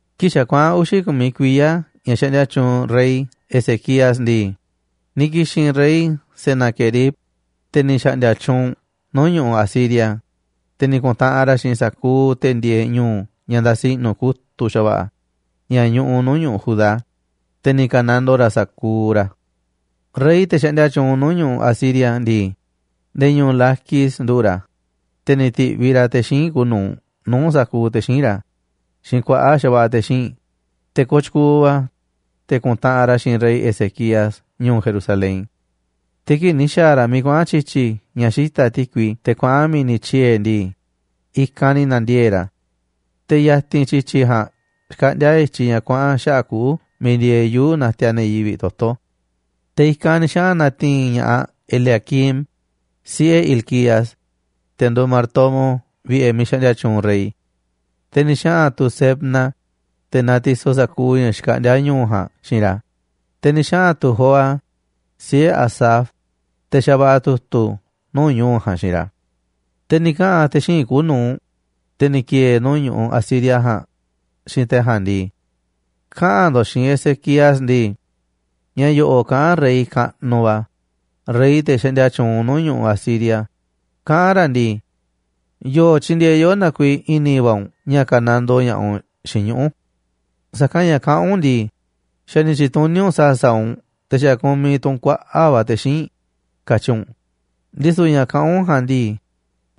Kii̱ꞌ xa̱ kuaꞌa̱n uxi̱ ku̱miꞌ kuiya̱ ña̱ xaꞌndia tyuunꞌ rey Ezequías ndii, ni̱ ki̱xi̱n rey Senaquerib, te̱ ni̱ xa̱ꞌndi̱a̱ tyuunꞌ nuu̱ꞌ ñu̱ꞌuꞌ Asiria, te̱ ni̱ ku̱ntaꞌanꞌ ra̱ xiinꞌ sa̱kuuꞌ te̱ ndieeꞌ ñu̱u̱ ña̱ ndasi i̱ꞌnu̱ kutu̱ꞌ xa̱va̱ꞌa̱ ña̱ ñuꞌuꞌ nuu̱ꞌ ñu̱ꞌuꞌ Judá, te̱ ni̱ ka̱nandoo ra̱ sa̱kuuꞌ ra̱. Rey, te̱ xaꞌndia tyuunꞌ nuu̱ꞌ ñu̱ꞌuꞌ Asiria ndii, nde̱e̱ ñu̱u̱ Laquis nduꞌu̱ꞌ ra̱, te̱ ni̱ ti̱viꞌ ra̱ te̱ xíinꞌ kuuꞌ nu̱uꞌ nuu̱ꞌ sa̱kuuꞌ te̱ xíinꞌ ra̱ xiinꞌ kuaꞌa̱ꞌ xa̱va̱ꞌa̱ te̱ xíinꞌ, te̱ kooꞌ tyukuuꞌ va̱, te̱ ku̱ntaꞌanꞌ ra̱ xiinꞌ rey Ezequías ñu̱u̱ Jerusalén. Te̱ kii̱ꞌ ni̱ xa̱a̱ ra̱ miiꞌ kuaꞌa̱n tyi̱tyi̱ ña̱ xita̱ꞌ ti̱kui teꞌ kuaꞌa̱n mi̱ni̱ tyiee̱ ndii, i̱kanꞌ ni̱ na̱ndiee̱ꞌ ra̱. Te̱ ya̱ti̱n tyi̱tyi̱ ja̱a̱nꞌ xkaꞌndíá i̱tyiꞌ ña̱ kuaꞌa̱n xaꞌa̱ꞌ kuꞌu̱ miiꞌ ndieeꞌ yuu̱ꞌ natiaꞌ ne̱ yivi̱ꞌ toto̱. Te̱ i̱kanꞌ ni̱ xaꞌa̱n na̱ti̱i̱n ña̱ꞌaꞌ Eliaquim, siꞌe̱ Hilcías, te̱ nduuꞌ martomo vi̱ꞌe̱ miiꞌ xaꞌndia tyuunꞌ rey. Te̱ ni̱ xaꞌa̱n tu̱ Sebna, te̱ natisoꞌ sa̱kuuꞌ ña̱ xkaꞌndíá ñu̱u̱ ja̱a̱nꞌ xiinꞌ ra̱, te̱ ni̱ xaꞌa̱n tu̱ Joa, siꞌe̱ Asaf, te̱ xavaꞌa̱ tu̱tu̱ nuu̱ꞌ ñu̱u̱ ja̱a̱nꞌ xiinꞌ ra̱. Te̱ ni̱ kaꞌa̱n te̱ xíinꞌ kuuꞌ nu̱uꞌ, te̱ ni̱ ki̱e̱e̱ nuu̱ꞌ ñu̱ꞌuꞌ Asiria ja̱a̱nꞌ, xiinꞌ te̱ ja̱a̱nꞌ ndii: ―Kaꞌa̱n ndo̱ꞌ xiinꞌ Ezequías ndii: “Ña̱ yo̱ꞌo̱ꞌ kaꞌán rey kaꞌnuꞌ va̱, rey te̱ xaꞌndia tyuunꞌ nuu̱ꞌ ñu̱ꞌuꞌ Asiria, kaꞌán ra̱ ndii: ¿Yo̱o̱ tyindieeꞌ yoꞌó na kuiiꞌ i̱ni̱ va̱ u̱nꞌ ña̱ ka̱nandoo ña̱ꞌaꞌ u̱nꞌ xiinꞌ ñuꞌu̱? Sa̱kanꞌ ña̱ kaꞌán u̱nꞌ ndii, xa̱ ni̱ tyi̱tuní u̱nꞌ sa̱a̱ sa̱a̱ u̱nꞌ te̱ xa̱ kumiꞌ tu̱ u̱nꞌ kuaꞌa̱ꞌ va̱ te̱ xíinꞌ, katyi u̱nꞌ, ndisu̱ ña̱ kaꞌán u̱nꞌ ja̱a̱nꞌ ndii,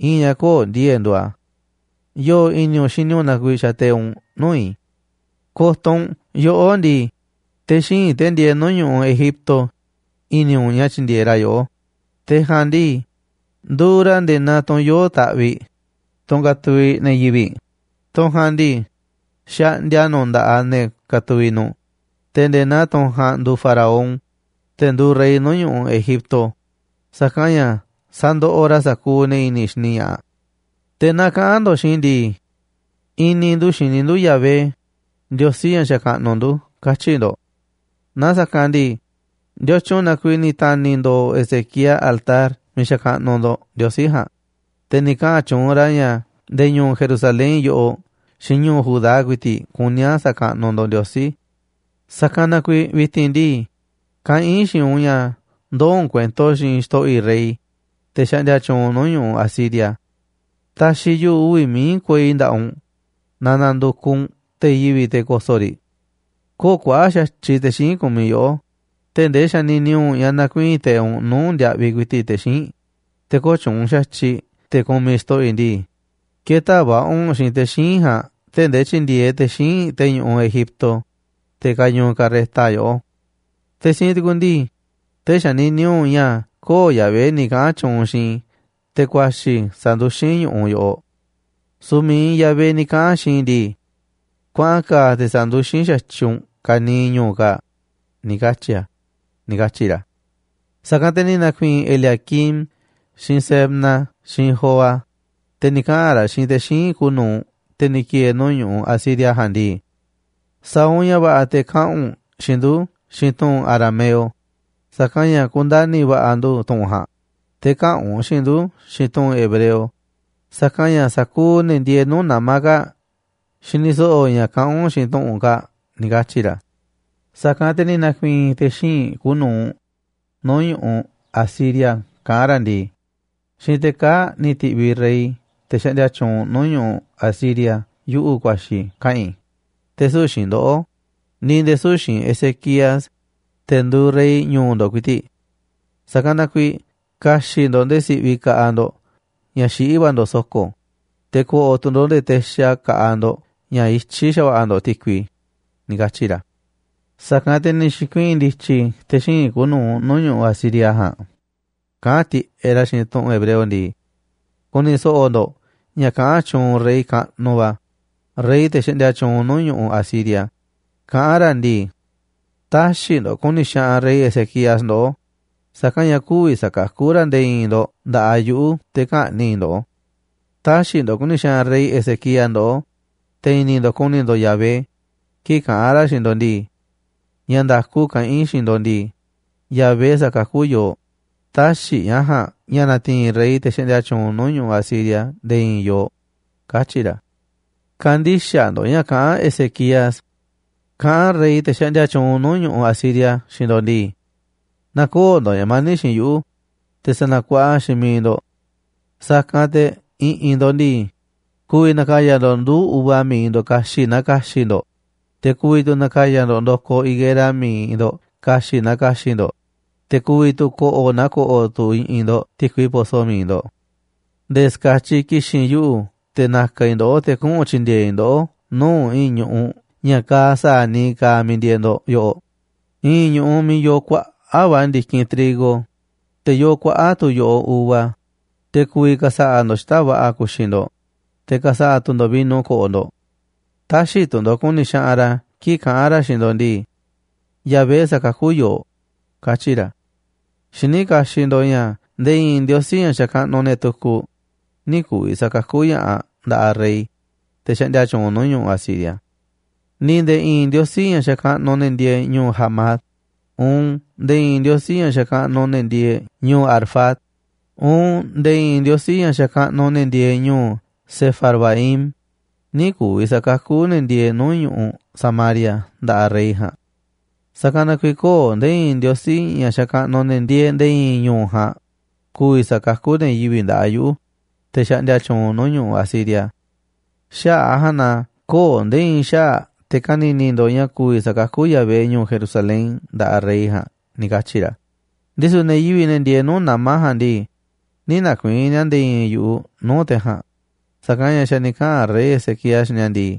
i̱i̱n ña̱ köo̱ꞌ ndi̱e̱e̱ꞌ nduuꞌ a̱. ¿Yo̱o̱ i̱ni̱ u̱nꞌ xini u̱nꞌ na kuiiꞌ xateiꞌ u̱nꞌ nuu̱ꞌ i̱? Ko̱to̱ u̱nꞌ, yoꞌó ndii, te̱ xíinꞌ, te̱ ndieeꞌ nuu̱ꞌ ñu̱ꞌuꞌ Egipto, i̱ni̱ u̱nꞌ ña̱ tyi̱ndi̱e̱eꞌ ra̱ yoꞌó. Te̱ ja̱a̱nꞌ ndii, nduuꞌ ra̱ nde̱e̱ naa tunꞌ yoo̱ꞌ taꞌviꞌ, tunꞌ katuviꞌ ne̱ yivi̱ꞌ, tunꞌ ja̱a̱nꞌ ndii, xaꞌndia nu̱ꞌ nda̱ꞌaꞌ ne̱ katuviꞌ nu̱ꞌ, te̱ nde̱e̱ naa tunꞌ ja̱a̱nꞌ nduuꞌ faraón, te̱ nduuꞌ rey nuu̱ꞌ ñu̱ꞌuꞌ Egipto, sa̱kanꞌ ña̱ sa̱ndoꞌoꞌ ra̱ sa̱kuuꞌ ne̱ i̱ni̱ xini ña̱ꞌaꞌ. Te̱ naaꞌ kaꞌa̱n ndo̱ꞌ xiinꞌ i̱ ndii: I̱ni̱ ndu̱ xini ndu̱ Yahvé, Ndiosí ña̱ xakaꞌnuꞌ ndu̱, katyi̱ ndo̱ꞌ. Naaꞌ sa̱kanꞌ ndii, ¿ndiotyun na kuiiꞌ ni̱ ta̱ni̱ ndo̱o̱ Ezequías altar miiꞌ xakaꞌnuꞌ ndo̱ꞌ Ndiosí ja̱a̱nꞌ, te̱ ni̱ kaꞌa̱n tyuunꞌ ra̱ ña̱ ndee ñu̱u̱ Jerusalén yoꞌoꞌ xiinꞌ ñuu Judá ku̱i̱ti̱ꞌ kuní a̱ sa̱kaꞌnuꞌ ndo̱ꞌ Ndiosí? Sa̱kanꞌ na kuiiꞌ vi̱ti̱n ndii, kaꞌán i̱ xiinꞌ u̱nꞌ ña̱ ndoo̱ u̱nꞌ kuento xiinꞌ xto̱ꞌo̱ i̱ rey, te̱ xaꞌndia tyuunꞌ nuu̱ꞌ ñu̱ꞌuꞌ Asiria. Ta̱xi̱ yuꞌu̱ uvi̱ mií kuei nda̱ꞌaꞌ u̱nꞌ naaꞌ na̱ndu̱kuꞌ u̱nꞌ te̱ yivi̱ꞌ, te̱ ko̱so̱ꞌ riꞌ. Köo̱ꞌ kuaꞌa̱ꞌ xa̱tyiꞌ te̱ xíinꞌ kumiꞌ yoꞌó, tee̱ꞌ ndee xanini u̱nꞌ ña̱ na̱kuii̱n teiꞌ u̱nꞌ nuu̱ꞌ ndiaꞌviꞌ ku̱i̱ti̱ꞌ te̱ xíinꞌ, te̱ köo̱ꞌ tyuunꞌ xa̱tyiꞌ te̱ kumiꞌ xto̱ꞌo̱ i̱ ndii, kë̱ta̱ va̱ꞌa̱ u̱nꞌ xiinꞌ te̱ xíinꞌ ja̱a̱nꞌ tee̱ꞌ ndee tyi̱ndi̱e̱eꞌ te̱ xíinꞌ te̱ ñu̱ꞌuꞌ Egipto, te̱ kañuuꞌ carreta, yoꞌó. Te̱ siinꞌ tukuꞌ ndii, tee̱ꞌ xanini u̱nꞌ ña̱ köo̱ꞌ Yahvé ni̱ kaꞌa̱n tyuunꞌ xiinꞌ i̱ te̱ ku̱a̱xi̱ sa̱nduxín i̱ ñu̱ꞌuꞌ yoꞌoꞌ. Su̱u̱ mi̱iꞌ Yahvé ni̱ kaꞌa̱n xiinꞌ i̱ ndii: Kuaꞌa̱n ka̱a̱ te̱ sa̱nduxín xa̱tyiꞌ u̱nꞌ ka̱niiꞌ ñu̱u̱ kaa̱ꞌ, ni̱ katyi̱ a̱” ―ni̱ katyi̱ ra̱. Sa̱kanꞌ te̱ ni̱ na̱ku̱i̱i̱n Eliaquim xiinꞌ Sebna xiinꞌ Joa, te̱ ni̱ kaꞌa̱n ra̱ xiinꞌ te̱ xíinꞌ kuuꞌ nu̱uꞌ, te̱ ni̱ ki̱e̱e̱ nuu̱ꞌ ñu̱ꞌuꞌ Asiria ja̱a̱nꞌ ndii: ―Sa̱a̱ u̱nꞌ ña̱ va̱ꞌa̱ te̱ kaꞌa̱n u̱nꞌ xiinꞌ ndu̱ xiinꞌ tu̱ꞌu̱n arameo, sa̱kanꞌ ña̱ ku̱ndani̱ va̱ꞌa̱ ndu̱ tu̱ꞌu̱n ja̱a̱nꞌ, te̱ käꞌa̱n u̱nꞌ xiinꞌ ndu̱ xiinꞌ tu̱ꞌu̱n hebreo, sa̱kanꞌ ña̱ sa̱kuuꞌ ne̱ ndieeꞌ nuu̱ꞌ nama̱ kaa̱ꞌ xini so̱ꞌo̱ ña̱ kaꞌán u̱nꞌ xiinꞌ tu̱ꞌu̱n kaa̱ꞌ ―ni̱ katyi̱ ra̱. Sa̱kanꞌ te̱ ni̱ na̱ku̱i̱i̱n te̱ xíinꞌ kuuꞌ nu̱uꞌ nuu̱ꞌ ñu̱ꞌuꞌ Asiria kaꞌán ra̱ ndii: ―Xiinꞌ te̱ kaa̱ꞌ ni̱ ti̱ꞌviꞌ rey, te̱ xaꞌndia tyuunꞌ nuuꞌ ñu̱ꞌuꞌ Asiria, yuꞌu̱ ku̱a̱xi̱ kaꞌa̱n i̱, te̱ süu̱ꞌ xiinꞌ ndoꞌó, ni̱ nde̱e̱ süu̱ꞌ xiinꞌ Ezequías, te̱ nduuꞌ rey ñu̱u̱ ndo̱ꞌ ku̱i̱ti̱ꞌ. Sa̱kanꞌ na kuiiꞌ ka̱xi̱ꞌ ndo̱ꞌ nde̱e̱ si̱ꞌviꞌ ka̱ꞌaꞌ ndo̱ꞌ ña̱ xiꞌí va̱ ndo̱ꞌ so̱ko̱, te̱ ko̱ꞌo̱ tu̱ nde̱e̱ texa ka̱ꞌaꞌ ndo̱ꞌ ña̱ i̱tyiꞌ xa̱va̱ꞌa̱ ndo̱ꞌ ti̱kui ―ni̱ katyi̱ ra̱. Sa̱kanꞌ te̱ ni̱ xi̱kuii̱n ndi̱tyi̱ te̱ xíinꞌ kuuꞌ nuu̱ꞌ ñu̱ꞌuꞌ Asiria ja̱a̱nꞌ kaꞌán tiꞌeꞌ ra̱ xiinꞌ tu̱ꞌu̱n hebreo ndii: ―Ku̱ni̱ so̱ꞌo̱ ndo̱ꞌ ña̱ kaꞌán tyuunꞌ rey kaꞌnuꞌ va̱, rey te̱ xaꞌndia tyuunꞌ nuu̱ꞌ ñu̱ꞌuꞌ Asiria, kaꞌán ra̱ ndii: “Tä̱xi̱ ndo̱ꞌ ku̱ni̱ xaꞌanꞌ rey Ezequías ndoꞌó, sa̱kanꞌ ña̱ kü̱vi̱ sa̱kakú ra̱ nde̱e̱ i̱i̱n ndo̱ꞌ nda̱ꞌaꞌ yuꞌu̱ te̱ kä̱ꞌni̱ꞌ i̱ ndoꞌó. Tä̱xi̱ ndo̱ꞌ ku̱ni̱ xaꞌanꞌ rey Ezequías ndoꞌó, te̱ i̱ni̱ ndo̱ꞌ ku̱ni̱ ndo̱ꞌ Yahvé kii̱ꞌ kaꞌa̱n ra̱ xiinꞌ ndo̱ꞌ ndii: Ña̱ nda̱ku kaꞌán i̱ xiinꞌ ndo̱ꞌ ndii, Yahvé sa̱kakú yooꞌ. Tä̱xi̱ ña̱ ja̱a̱nꞌ ña̱ na̱ti̱i̱n rey, te̱ xaꞌndia tyuunꞌ nuu̱ꞌ ñu̱ꞌuꞌ Asiria, nde̱e̱ i̱i̱n yooꞌ, katyi̱ ra̱.” ¡Kä̱ndi̱xaꞌ ndo̱ꞌ ña̱ kaꞌán Ezequías! Kaꞌán rey, te̱ xaꞌndia tyuunꞌ nuu̱ꞌ ñu̱ꞌuꞌ Asiria xiinꞌ ndo̱ꞌ ndii: “Na̱koo̱ꞌ ndo̱ꞌ ña̱ mani̱ꞌ xiinꞌ yuꞌu̱, te̱ sa̱na̱kuaꞌa xiinꞌ mi̱iꞌ ndo̱ꞌ. Sa̱kanꞌ te̱ i̱ꞌi̱n ndo̱ꞌ ndii, ku̱vi̱ na̱ka̱ya̱ ndo̱ꞌ nduu̱ꞌ uva mi̱iꞌ ndo̱ꞌ ka̱xi̱ꞌ naa ka̱xi̱ꞌ ndo̱ꞌ, te̱ ku̱vi̱ tu̱ na̱ka̱ya̱ ndo̱ꞌ ndo̱koꞌ higuera mi̱iꞌ ndo̱ꞌ ka̱xi̱ꞌ naa ka̱xi̱ꞌ ndo̱ꞌ, te̱ ku̱vi̱ tu̱ ko̱ꞌo̱ naa ko̱ꞌo̱ tu̱ i̱ꞌi̱n ndo̱ꞌ ti̱kui poso mi̱iꞌ ndo̱ꞌ. Nde̱e̱ ska̱tyiꞌ ki̱xi̱n yuꞌu̱ te̱ na̱ka̱ i̱ ndoꞌó te̱ kuꞌu̱n tyi̱ndi̱e̱e̱ i̱ ndoꞌó nuu̱ꞌ i̱i̱n ñu̱ꞌuꞌ ña̱ kaaꞌ sa̱a̱ niiꞌ kaaꞌ miiꞌ ndieeꞌ ndo̱ꞌ yoꞌoꞌ, i̱i̱n ñu̱ꞌuꞌ miiꞌ yooꞌ kuaꞌa̱ꞌ va̱ ndi̱kinꞌ trigo, te̱ yoo kuaꞌa̱ꞌ tu̱ yo̱ꞌoꞌ uva, te̱ ku̱vi̱ ka̱sa̱ꞌa̱ ndo̱ꞌ xita̱ꞌ va̱ꞌa̱ ku̱xi̱ ndo̱ꞌ, te̱ ka̱sa̱ꞌa̱ tu̱ ndo̱ꞌ vino ko̱ꞌo̱ ndo̱ꞌ. Tä̱xi̱ tu̱ ndo̱ꞌ ku̱ni̱ xaꞌanꞌ ra̱ kii̱ꞌ kaꞌa̱n ra̱ xiinꞌ ndo̱ꞌ ndii: Yahvé sa̱kakú yooꞌ, katyi̱ ra̱. Xiní kaxiꞌ ndo̱ꞌ ña̱ nde̱e̱ i̱i̱n ndiosí ña̱ xakaꞌnuꞌ ne̱ tukuꞌ nï̱ ku̱vi̱ sa̱kakú ña̱ꞌaꞌ nda̱ꞌaꞌ rey, te̱ xaꞌndia tyuunꞌ nuu̱ꞌ ñu̱ꞌuꞌ Asiria. Ni̱ nde̱e̱ i̱i̱n ndiosí ña̱ xakaꞌnuꞌ ne̱ ndieeꞌ ñu̱u̱ Hamat, uun nde̱e̱ i̱i̱n ndiosí ña̱ xakaꞌnuꞌ ne̱ ndieeꞌ ñu̱u̱ Arfad, uun nde̱e̱ i̱i̱n ndiosí ña̱ xakaꞌnuꞌ ne̱ ndieeꞌ ñu̱u̱ Sefarvaim nï̱ ku̱vi̱ sa̱kakú ne̱ ndieeꞌ nuu̱ꞌ ñu̱ꞌuꞌ Samaria nda̱ꞌaꞌ rey ja̱a̱nꞌ. Sa̱kanꞌ na kuiiꞌ köo̱ꞌ nde̱e̱ i̱i̱n ndiosí ña̱ xakaꞌnuꞌ ne̱ ndieeꞌ nde̱e̱ i̱i̱n ñu̱u̱ ja̱a̱nꞌ ku̱vi̱ sa̱kakú ne̱ yivi̱ꞌ nda̱ꞌaꞌ yuꞌu̱, te̱ xaꞌndia tyuunꞌ nuu̱ꞌ ñu̱ꞌuꞌ Asiria. Xaꞌa̱ꞌ a̱ ja̱a̱nꞌ na köo̱ꞌ nde̱e̱ i̱i̱n xaꞌa̱ꞌ te̱ ka̱ni̱ni̱ ndo̱ꞌ ña̱ ku̱vi̱ sa̱kakú Yahvé ñu̱u̱ Jerusalén nda̱ꞌaꞌ rey ja̱a̱nꞌ” ―ni̱ katyi̱ ra̱. Ndisu̱ ne̱ yivi̱ꞌ, ne̱ ndieeꞌ nuu̱ꞌ nama̱ ja̱a̱nꞌ ndii, nï̱ na̱ku̱i̱i̱n ni̱a̱ nde̱e̱ i̱i̱n yu̱ꞌuꞌ nuu̱ꞌ te̱ ja̱a̱nꞌ, sa̱kanꞌ ña̱ xa̱ ni̱ kaꞌa̱n rey Ezequías xiinꞌ ni̱a̱ ndii: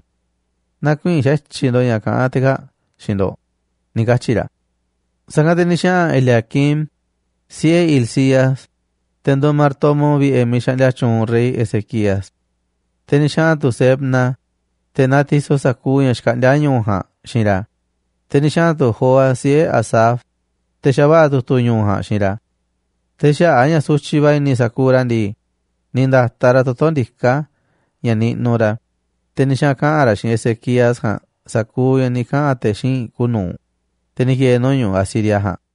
“Nä̱ku̱i̱i̱n xa̱tyiꞌ ndo̱ꞌ ña̱ kaꞌán te̱ kaa̱ꞌ xiinꞌ ndo̱ꞌ”, ni̱ katyi̱ ra̱. Sa̱kanꞌ te̱ ni̱ xaꞌa̱n Eliaquim, siꞌe̱ Hilcías, te̱ nduuꞌ martomo vi̱ꞌe̱ miiꞌ xaꞌndia tyuunꞌ rey Ezequías. Te̱ ni̱ xaꞌa̱n tu̱ Sebna, te̱ natisoꞌ sa̱kuuꞌ ña̱ xkaꞌndíá ñu̱u̱ ja̱a̱nꞌ xiinꞌ ra̱, te̱ ni̱ xaꞌa̱n tu̱ Joa, siꞌe̱ Asaf, te̱ xavaꞌa̱ tu̱tu̱ ñu̱u̱ ja̱a̱nꞌ xiinꞌ ra̱. Te̱ xaꞌa̱ꞌ a̱ ña̱ sutyiꞌ va̱ i̱ni̱ sa̱kuuꞌ ra̱ ndii, ni̱ nda̱taꞌ ra̱ toto̱ ndiká ña̱ niꞌnuꞌ ra̱, te̱ ni̱ xaꞌa̱n kaꞌa̱n ra̱ xiinꞌ Ezequías ja̱a̱nꞌ sa̱kuuꞌ ña̱ ni̱ kaꞌa̱n te̱ xíinꞌ kuuꞌ nu̱uꞌ, te̱ ni̱ ki̱e̱e̱ nuu̱ꞌ ñu̱ꞌuꞌ Asiria ja̱a̱nꞌ.